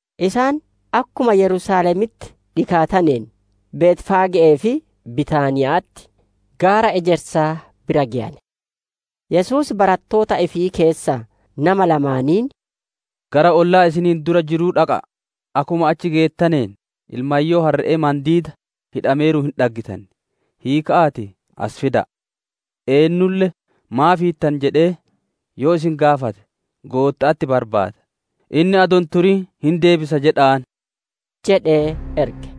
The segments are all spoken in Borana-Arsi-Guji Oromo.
Isaan akkuma Yerusaalemitti dhikaataneen, Betfaage'ee fi Bitaaniya'atti, gaara Ejersaa bira geyane. Yesuus barattoota ifii keessaa nama lamaaniin, «Gara ollaa isiniin dura jiruu dhaqa'a; akkuma achi geettaneen ilmayyoo harre'ee mandiida hidhameeruun hin dhaggitan; hiika'aatii as fida'a. Eennulle ‹Maaf hiittan?› jedhee yoo isin gaafate, ‹Gootta'atti barbaada; inni adoo hin turin hin deebisa› jedha'aan» jedhee erge.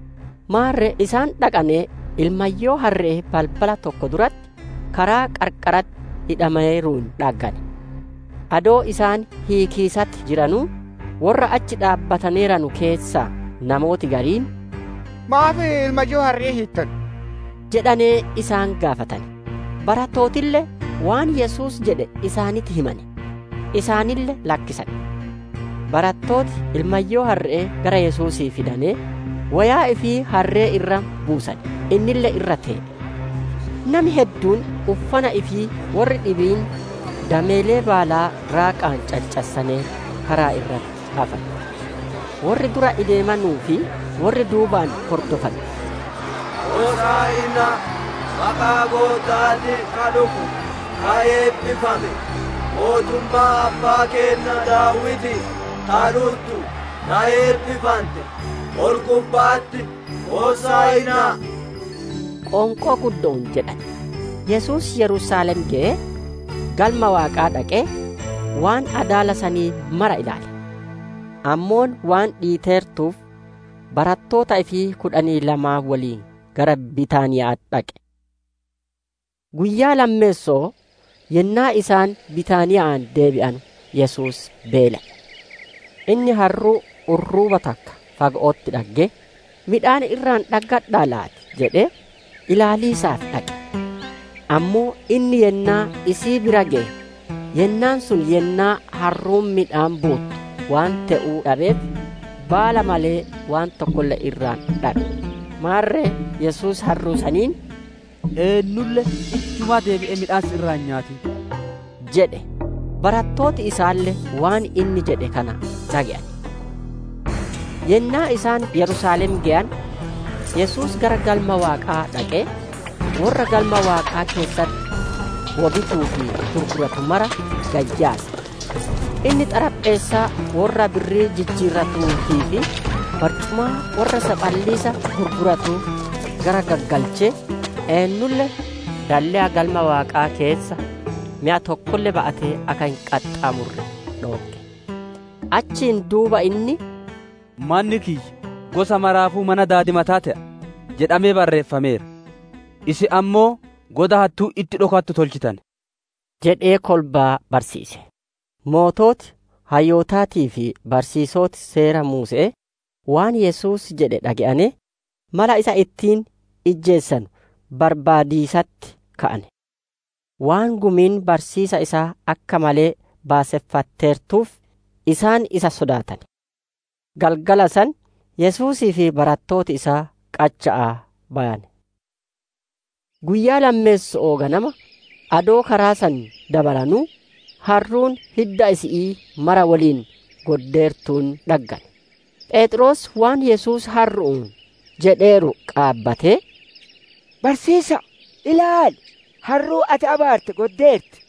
Maarre isaan dhaqanee, ilmayyoo harre'ee balbala takka duratti, karaa qarqaratti hidhameeruun dhaggane. Adoo isaan hiikiisatti jiranuu, worra achi dhaabbataneeranu keessaa namooti gariin, «Maaf ilmayyoo harre'ee hiittan?» jedhanee isaan gaafatane. Barattootille waan Yesuus jedhe isaanitti himane; isaanille lakkisane. Barattooti ilmayyoo harre'ee gara Yesuusii fidanee, woyaa ifii harree irra buusane; innille irra tee'e. Nami hedduun uffana ifii, worri dhibiin dameelee baalaa raaqaa caccassanee karaa irratti afane. Worri dura ideemanuu fi worri duubaan hordofanu, «Hosaa'inaa! maqaa Gootta'aatiin ka dhufu ka eebbifame! Mootummaan abbaa keenna Daawitii ta dhuttu ta eebbifante! Ol-gubba'atti Hosaa'inaa!» qoonqoo guddo'oon jedhane. Yesuus Yerusaalem geyee, Galma Waaqaa dhaqee, waan adaala sanii mara ilaale. Ammoo waan dhiiteertuuf barattoota ifii kudhanii lamaan wolii gara Bitaaniya'aa dhaqe. Guyyaa lammeesso'oo yennaa isaan Bitaaniya'aa deebi'anu Yesuus beelaye. Inni harruu urruuba takka fago'otti dhaggee, midhaan irraa dhaggadhaa laati jedhee, ilaaliisaaf dhaqe. Ammoo inni yennaa isii bira geye, yennaan sun yennaa harruun midhaan buuttu waan te'uu dhabeef, baala malee waan tokkolle irraa dhabe. Maarre Yesuus harruu saniin, «Eennulle ijjumaa deebi'ee midhaan si irraa hin nyaatin!» jedhe. Barattooti isaalle waan inni jedhe kana dhage'ane. Yennaa isaan Yerusaalem geyane, Yesuus gara Galma Waaqaa dhaqee, worra Galma Waaqaa keessatti wo bituu fi gurguratu mara gad yaase. Inni Xarapheessaa worra birrii jijjiiratuutii fi barcumaa worra saphaliisa gurguratuu garaggaggalchee, eennulle dalleya Galma Waaqaa keessa meya tokkolle ba'atee akka hin qaxxaamurre dhoogge. Achiin duuba inni, « ‹Manni kiyya gosa maraafuu mana daadimataa te'a› jedhamee barreeffameera. Isin ammoo goda hattuun itti dhokattu tolchitane» jedhee kolbaa barsiise. Sooreyyiin hayyootaatii fi barsiisoti Seera Muuse'ee, waan Yesuus jedhe dhage'anee, mala isa ittiin ijjeesanu barbaadiisatti ka'ane. Waan gumiin barsiisa isaa akka malee baaseffatteertuuf, isaan isa sodaatane. Galgala san, Yesuusii fi barattooti isaa qacha'aa bayane. Guyyaa lammeesso'oo ganama, adoo karaa san dabaranuu, harruun hidda isi'ii mara woliin goddeertuun dhaggane. Pheexroos waan Yesuus harru'uun jedheeru qaabatee, «Barsiisa'a, ilaali! Harruun ati abaarte goddeerti»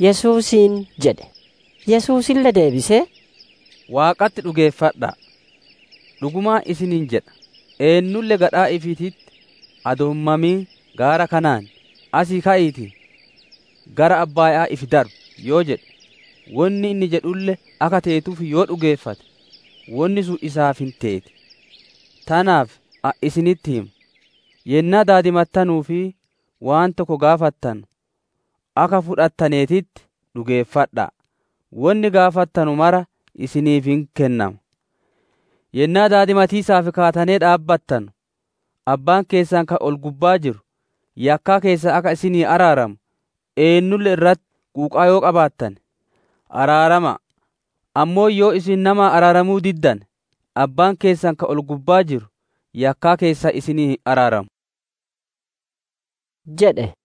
Yesuusiin jedhe. Yesuusille deebisee, «Waaqatti dhugeeffadha'a. Dhugumaan isiniin jedha; eennulle gadhaa ifiititti adoo hin mamin gaara kanaan, ‹Asii ka'iitii, gara abbaaya'aa ifi darbi!› yoo jedhe, wonni inni jedhulle akka teetuuf yoo dhugeeffate, wonni sun isaaf hin teeti. Tanaaf ani isinitti hima; yennaa daadimattanuu fi waan tokko gaafattanu, akka fudhattaneetitti dhugeeffadha'a; wonni gaafattanu mara isiniif hin kennama. «Yennaa daadimatiisaaf kaatanee dhaabbattanu, abbaan keessan ka ol-gubbaa jiru yakkaa keessan akka isinii araaramu, eennulle irratti quuqaa yoo qabaattane araarama'a. [ Ammoo yoo isin namaa araaramuu diddane, abbaan keessan ka ol-gubbaa jiru yakkaa keessan isinii hin araaramu]» jedhe.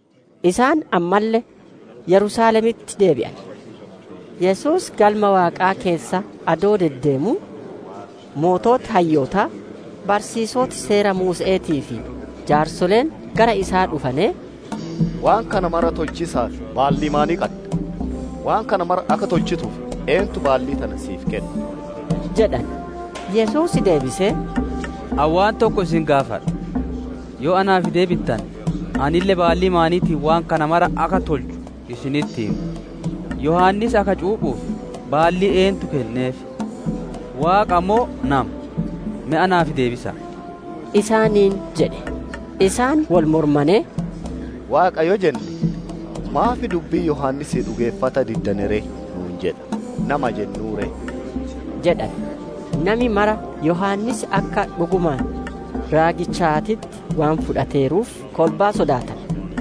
Isaan ammalle Yerusaalemitti deebi'ane. Yesuus Galma Waaqaa keessa adoo deddeemuu, sooreyyii hayyootaa, barsiisoti Seera Muuse'eetii fi jaarsoleen gara isaa dhufanee, «Waan kana mara tolchiisaaf baallii maanii qadda? Waan kana mara akka tolchituuf eennutti baallii tana si'iif kenne?» jedhane. Yesuus deebisee, «Ani waan tokko isin gaafadha; yoo naaf deebittane, anille baallii maaniitiin waan kana mara akka tolchu isinitti hima. Yohaannis akka cuuphuuf baallii eennutti kenneef? Waaqa mo'o nama? Me naaf deebisa'a!» isaaniin jedhe. Isaan wol mormanee, «Waaqa yoo jenne, ‹Maaf dubbii Yohaannisii dhugeeffata diddane ree?› nu'uun jedha; ‹Nama jennuu ree?›» jedhane. Nami mara Yohaannis akka dhugumaan raagichaatitti waan fudhateeruuf, kolbaa sodaatane.